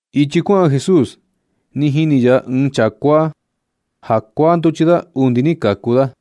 Ichi kuaꞌan Jesús, ni jini ya ɨɨn chaa kuaa, ja kuaa nduchi da undi ni kaku da.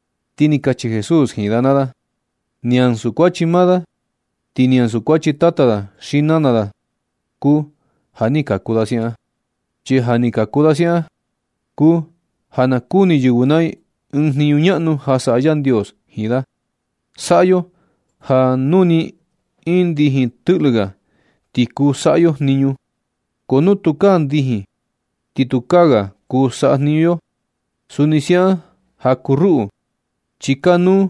Ti ni kachi Jesús jiin da naa da: ―Ni ansu kuachi maa da, ti ni ansu kuachi tata da xi nana da kuu ja ni kaku da siaꞌan. Chi ja ni kaku da siaꞌan kuu ja na kuni yɨvɨ naa i ɨɨn jniñu ñaꞌnu ja saꞌa Yandios jiin da. Saꞌa yo ja nu nɨ iin ndijin tɨꞌlɨ ga, ti kuu saꞌa yo jniñu, ko nu tukaa ndijin, ti tukaa ga kuu saꞌa jniñu yo. Suni siaꞌan ja kuu ruꞌu, chi kanuu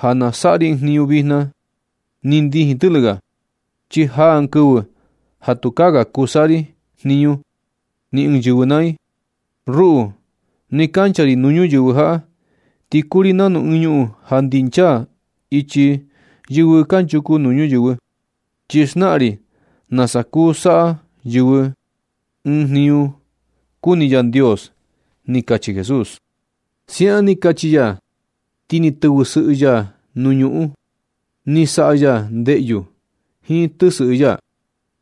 ja na saꞌa ri ɨɨn jniñu vijna nɨ ndijin tɨꞌlɨ ga, chi jan ɨɨn kɨvɨ ja tukaa ga kuu saꞌa jniñu ni ɨɨn yɨvɨ naa i. Ruꞌu, nɨ kancha ri nuu ñuyɨvɨ jaꞌa, ti kuu ri nanu ɨɨn ñuꞌun ja ndinchaa ichi yɨvɨ kanchuku nuu ñuyɨvɨ, chi xnaꞌan ri nasa kuu saꞌa yɨvɨ ɨɨn jniñu kuni Yandios ―ni kachi Jesús. Siaꞌan ni kachi ya, ti ni tɨvɨsɨꞌɨ ya nuu ñuꞌun. Ni saꞌa ya ndeꞌyu jiin tɨsɨꞌɨ ya,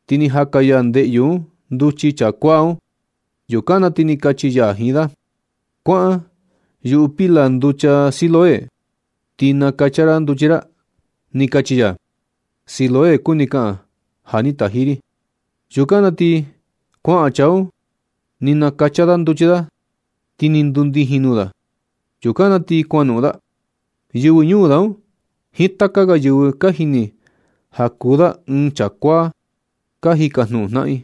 ti ni jaka ya ndeꞌyu un nduchi chaa kuaa un. Yukan na ti ni kachi ya jiin da: ―Kuaꞌan yuꞌu pila nducha Siloé un, ti nakacha ra nduchi ra ―ni kachi ya. (Siloé kuni kaꞌan: “Ja ni taji ri.”) Yukan na ti kuaꞌan chaa un, ni nakacha da nduchi da, ti ni ndundijin nuu da. Yukan na ti kuanoꞌon da. Yɨvɨ ñuu da un jiin taka ga yɨvɨ ka jini ja kuu da ɨɨn chaa kuaa, ka jikajnuꞌun jnaꞌan i: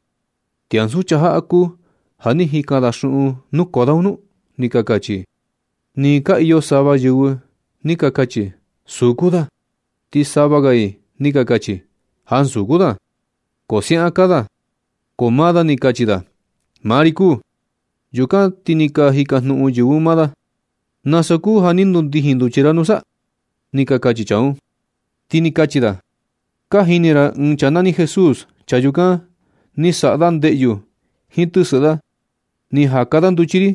―¿Ti ansu chaa jaꞌa kuu ja ni jikan da xuꞌun nukoo da un nu? ―ni ka kachi i. Ni ka iyo sava yɨvɨ ni ka kachi: ―Suu kuu da. Ti sava ga i ni ka kachi: ―Ansu kuu da, ko siaꞌan kaa da. Ko maa da ni kachi da: ―Maa ri kuu. Yukan ti ni ka jikajnuꞌun yɨvɨ un maa da: ―¿Nasa kuu ja ni ndundijin nduchi ra nusa? ―ni ka kachi chaa un. Ti ni kachi da: ―Ka jini ra ɨɨn chaa nani Jesús. Chaa yukan, ni saꞌa da ndeꞌyu jiin tɨsɨꞌɨ da, ni jaka da nduchi ri,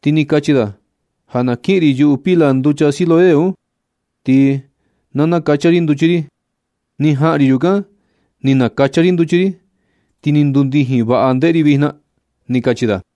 ti ni kachi da ja na kiꞌin ri yuꞌu pila nducha Siloé un, ti na nakacha ri nduchi ri. Ni jaꞌan ri yukan, ni nakacha ri nduchi ri, ti ni ndundijin vaꞌa ndeꞌe ri vijna ―ni kachi da.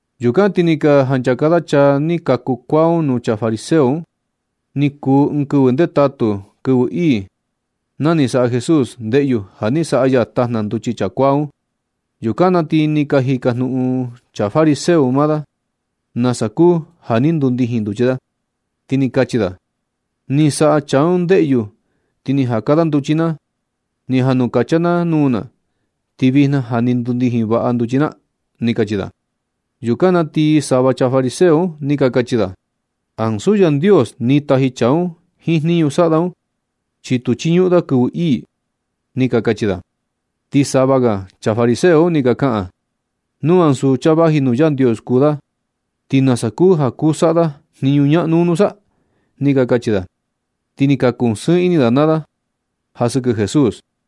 Yukan ti ni ka janchaka da chaa ni kaku kuaa un nuu chaa fariseo un. Ni kuu un ɨɨn kɨvɨ ndetatu, kɨvɨ ii, na ni saꞌa Jesús ndeꞌyu ja ni saꞌa ya tajna nduchi chaa kuaa un. Yukan na ti ni ka jikajnuꞌun chaa fariseo un maa da nasa kuu ja ni ndundijin nduchi da. Ti ni kachi da: ―Ni saꞌa chaa un ndeꞌyu ti ni jaka da nduchi na, ni janukacha na nuu na, ti vijna ja ni ndundijin vaꞌa nduchi na ―ni kachi da. Yukan na ti sava chaa fariseo un ni ka kachi da: ―Ansu Yandios ni taji chaa un jiin jniñu saꞌa da un, chi tu chiñuꞌun da kɨvɨ ii ―ni ka kachi da. Ti sava ga chaa fariseo un ni ka kaꞌan: ―Nu ansu chaa vaji nuu Yandios kuu da, ¿ti nasa kuu ja kuu saꞌa da jniñu ñaꞌnu un nusa? ―ni ka kachi da. Ti ni ka kusɨɨn ini da naa da ja sɨkɨ Jesús.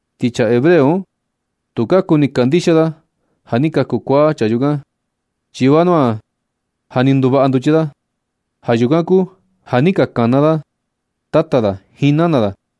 Ti chaa hebreo un, tu ka kuni kandixia da ja ni kaku kuaa chaa yukan, chi vanua ja ni nduvaꞌa nduchi da. Ja yukan kuu ja ni ka kana da tata da jiin nana da,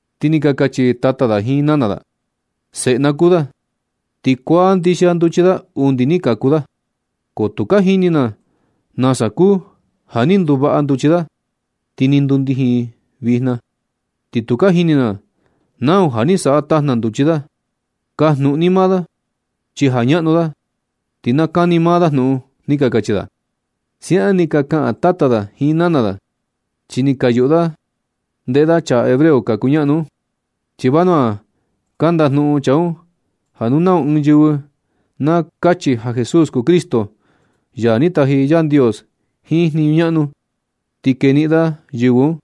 Ti ni ka kachi tata da jiin nana da: ―Seꞌe na kuu da, ti kuaa ndixia nduchi da undi ni kaku da, ko tu ka jini na nasa kuu ja ni nduvaꞌa nduchi da, ti ni ndundijin vijna. Ni tu ka jini na nau ja ni saꞌa tajna nduchi da. Kajnuꞌun ni maa da chi ja ñaꞌnu da, ti na kani maa da jnuꞌun ―ni ka kachi da. Siaꞌan ni ka kaꞌan tata da jiin nana da, chi ni ka yuꞌu da ndeꞌe da chaa hebreo ka kuñaꞌnu un. Chi vanua ka ndajnuꞌun chaa un ja nu nau ɨɨn ɨɨn yɨvɨ na kachi ja Jesús kuu Cristo, ya ni taji Yandios jiin jniñu ñaꞌnu, ti keniꞌin da yɨvɨ un,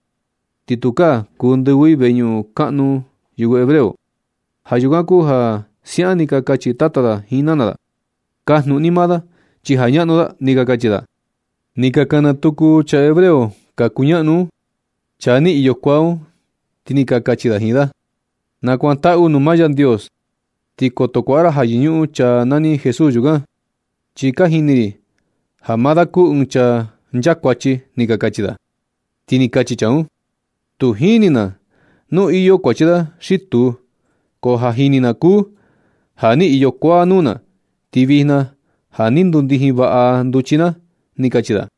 ti tukaa kuu ndɨvɨ i ini veñuꞌun kaꞌnu yɨvɨ hebreo. Ja yukan kuu ja siaꞌan ni ka kachi tata da jiin nana da: ―Kajnuꞌun maa ni da naa, chi ja ñaꞌnu da ―ni ka kachi da. Ni ka kana tuku chaa hebreo ka kuñaꞌnu un, chaa ni iyo kuaa un, ti ni ka kachi da jiin da: ―Nakuantaꞌu nuu maa Yandios, ti koto kuaꞌa ra ja yɨñuꞌun chaa nani Jesús yukan, chi ka jini ri ja maa da kuu ɨɨn chaa nchakuachi ―ni ka kachi da. Ti ni kachi chaa un: ―Tu jini na nu iyo kuachi da xi tu, ko ja jini na kuu ja ni iyo kuaa nuu na, ti vijna ja ni ndundijin vaꞌa nduchi na ―ni kachi da.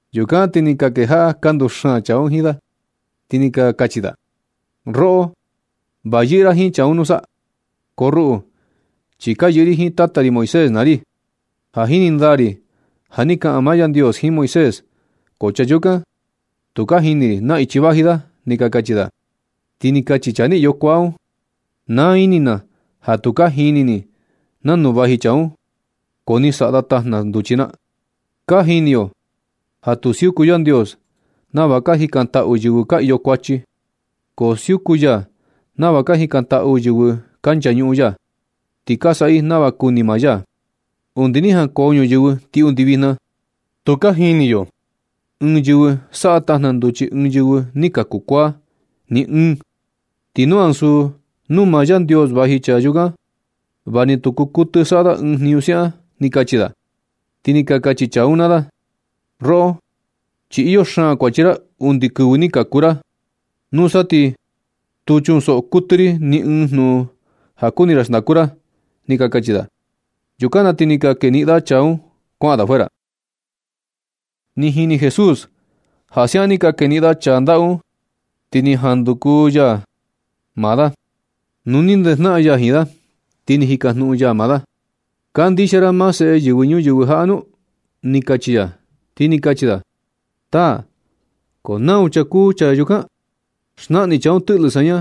Yukan ti ni ka kejaꞌa ka nduxaan chaa un jiin da, ti ni ka kachi da: ―Roꞌo, va yɨꞌɨ ra jiin chaa un nusa. Ko ruꞌu, chi ka yɨꞌɨ ri jiin tata ri Moisés naa ri. Ka jini ndaa ri ja ni kaꞌan maa Yandios jiin Moisés, ko chaa yukan, tu ka jini ri na ichi vaji da ―ni ka kachi da. Ti ni kachi chaa ni iyo kuaa un: ―Naa ini na ja tu ka jini ni nanu vaji chaa un, ko ni saꞌa da tajna nduchi na. Ka jini yo ja tu siuku Yandios nava ka jikantaꞌu yɨvɨ ka iyo kuachi. Ko siuku ya nava ka jikantaꞌu yɨvɨ ka nchañuꞌun ya, ti ka saꞌa i nava kuni maa ya. Undi ni jankoo ñuyɨvɨ, ti undi vijna, tu ka jini yo ɨɨn yɨvɨ saꞌa tajna nduchi ɨɨn yɨvɨ ni kaku kuaa. Ni ɨɨn. Ti nu ansu nuu maa Yandios vaji chaa yukan, va ni tu kuu kuɨtɨ saꞌa da ɨɨn jniñu siaꞌan ―ni kachi da. Ti ni ka kachi chaa un naa da: ―Roꞌo chi iyo xaan kuachi ra undi kɨvɨ ni kaku ra. Nusa ti tu chunsoꞌo kuɨtɨ ri ni ɨɨn jnuꞌun ja kuni ra xndaku ra ―ni ka kachi da. Yukan na ti ni ka keniꞌin da chaa un kuaꞌan da fuera. Ni jini Jesús ja siaꞌan ni ka keniꞌin da chaa ndaꞌu un, ti ni jan nunduku ya maa da. Nu ni ndejnaꞌan ya jiin da, ti ni jikajnuꞌun ya maa da: ―¿Kandixia ra maa Seꞌe Yɨvɨ Ñuyɨvɨ jaꞌa nu? ―ni kachi ya. Ti ni kachi da: ―Taa, ¿ko nau chaa kuu chaa yukan? Xnaꞌan ni chaa un tɨꞌlɨ saña,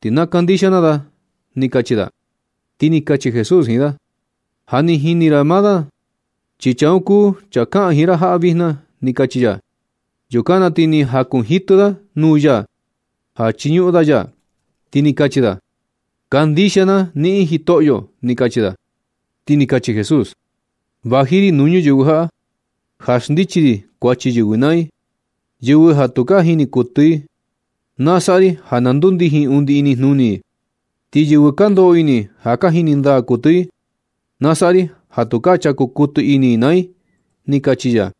ti na kandixia na da ―ni kachi da. Ti ni kachi Jesús jiin da: ―Ja ni jini ra maa da, ti chaa un kuu chaa kaꞌan jiin ra jaꞌa vijna ―ni kachi ya. Yukan na ti ni jakunjitɨ da nuu ya ja nachiñuꞌun da ya, ti ni kachi da: ―Kandixia na niꞌin, Jitoꞌyo ―ni kachi da. Ti ni kachi Jesús: ―Vaji ri nuu ñuyɨvɨ jaꞌa ja xndichi ri kuachi yɨvɨ naa i. Yɨvɨ ja tu ka jini kuɨtɨ, na saꞌa ri ja na ndundijin undi inijnuni i. Ti yɨvɨ ka ndoꞌo ini ja ka jini ndaa kuɨtɨ i, na saꞌa ri ja tukaa chaku kuɨtɨ ini i naa i ―ni kachi ya.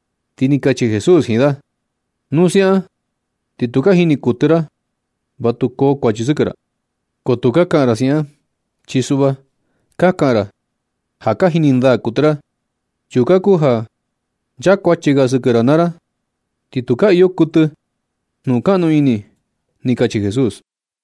Ti ni kachi Jesús jiin da: ―Nu siaꞌan ti tu ka jini kuɨtɨ ra, va tu koo kuachi sɨkɨ ra. Ko tu ka kaꞌan ra siaꞌan. Chi suꞌva ka kaꞌan ra ja ka jini ndaa kuɨtɨ ra. Yukan kuu ja ka nchakuachi ga sɨkɨ ra naa ra, ti tukaa kuɨtɨ iyo jnukaꞌnu ini ―ni kachi Jesús.